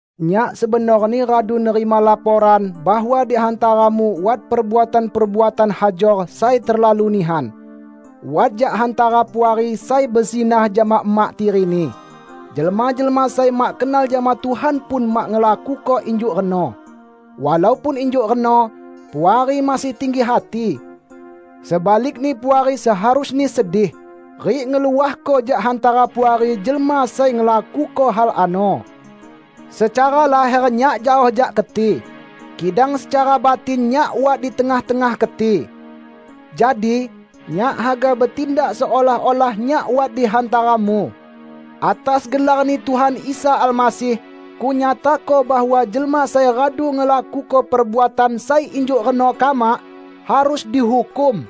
Nyak sebenorni radu nerima laporan bahwa di hantaramu wat perbuatan-perbuatan hajor sai terlalu nihan: Wat jak hantara Puari sai bezinah jama emak tirini. Jelma-jelma sai mak kenal jama Tuhan pun mak ngelakuko injuk reno! Walaupun injuk reno, Puari masih tinggi hati. Sebalikni Puari seharusni sedih, rik ngeluahko jak hantara Puari jelma sai ngelakuko hal ano. Secara laher nyak jaoh jak keti, kidang secara batin nyak wat di tengah-tengah keti. Jadi, nyak haga betindak seolah-olah nyak wat di hantaramu, "Atas gelar-Ni Tuhan Isa Almasih, kunyatako bahwa jelma sai radu ngelakuko perbuatan sai injuk reno kamak, harus dihukum!"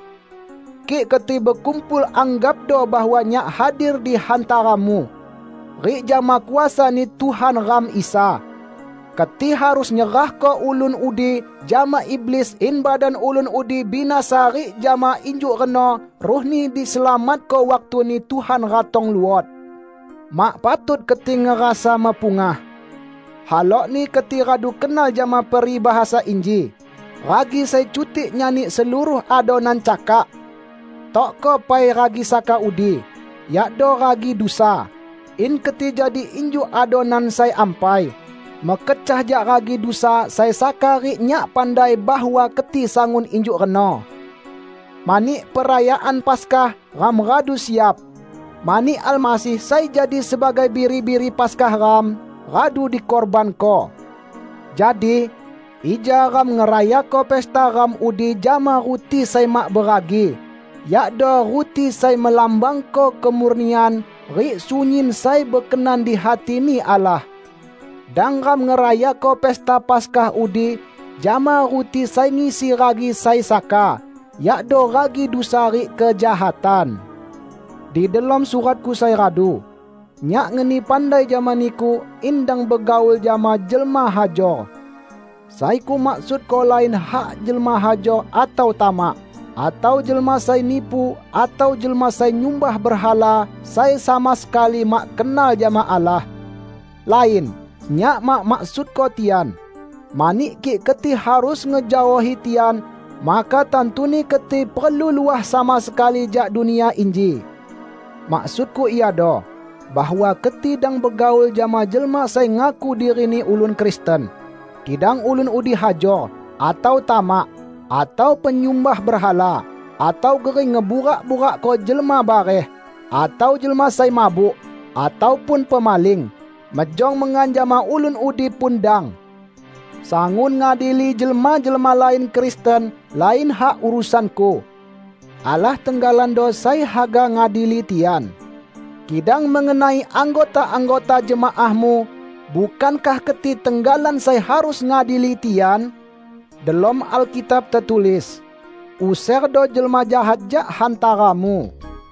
Kik keti bekumpul anggapdo bahwa nyak hadir di hantaramu, rik jama kuasa-Ni Tuhan ram Isa, keti harus nyerahko ulun udi jama iblis in badan ulun udi binasa rik jama injuk reno ruhni diselamatko waktu-Ni Tuhan ratong luot. Mak patut keti ngerasa mepungah. Halokni keti radu kenal jama peribahasa inji, "Ragi sai cutik nyani seluruh adonan cakak!" Tokko pai ragi saka udi, yakdo ragi dusa, in keti jadi injuk adonan sai ampai, mekecah jak ragi dusa sai saka rik nyak pandai bahwa keti sangun injuk reno. Mani, perayaan Paskah ram radu siap, mani Almasih sai jadi sebagai biri-biri Paskah ram, radu dikurbanko. Jadi, ija ram ngerayako pesta ram udi jama ruti sai mak beragi, yakdo ruti sai melambangko kemurnian rik sunyin sai bekenan di hati-Ni Allah. Dang ram ngerayako pesta Paskah udi jama ruti sai ngisi ragi sai saka, yakdo ragi dusa rik kejahatan. Di delom suratku sai radu, nyak ngeni pandai jama niku in dang begaul jama jelma hajor. Sai kumaksudko lain hak jelma hajor atau tamak, atau jelma sai nipu atau jelma sai nyumbah berhala sai sama sekali mak kenal jama Allah. Lain! Nyak mak maksudko tian; mani kik keti harus ngejaohi tian, maka tantuni keti perlu luah sama sekali jak dunia inji. Maksudku iado, bahwa keti dang begaul jama jelma sai ngaku dirini ulun Kristen, kidang ulun udi hajor, atau tamak, atau penyumbah berhala, atau gering ngeburak-burakko jelma bareh, atau jelma sai mabuk, ataupun pemaling. Mejong mengan jama ulun udi pun dang! Sangun ngadili jelma-jelma lain Kristen lain hak urusanku. Allah tenggalando sai haga ngadili tian. Kidang mengenai anggota-anggota jemaahmu, bukankah keti tenggalan sai harus ngadili tian? Delom Alkitab tetulis, "Userdo jelma jahat jak hantaramu."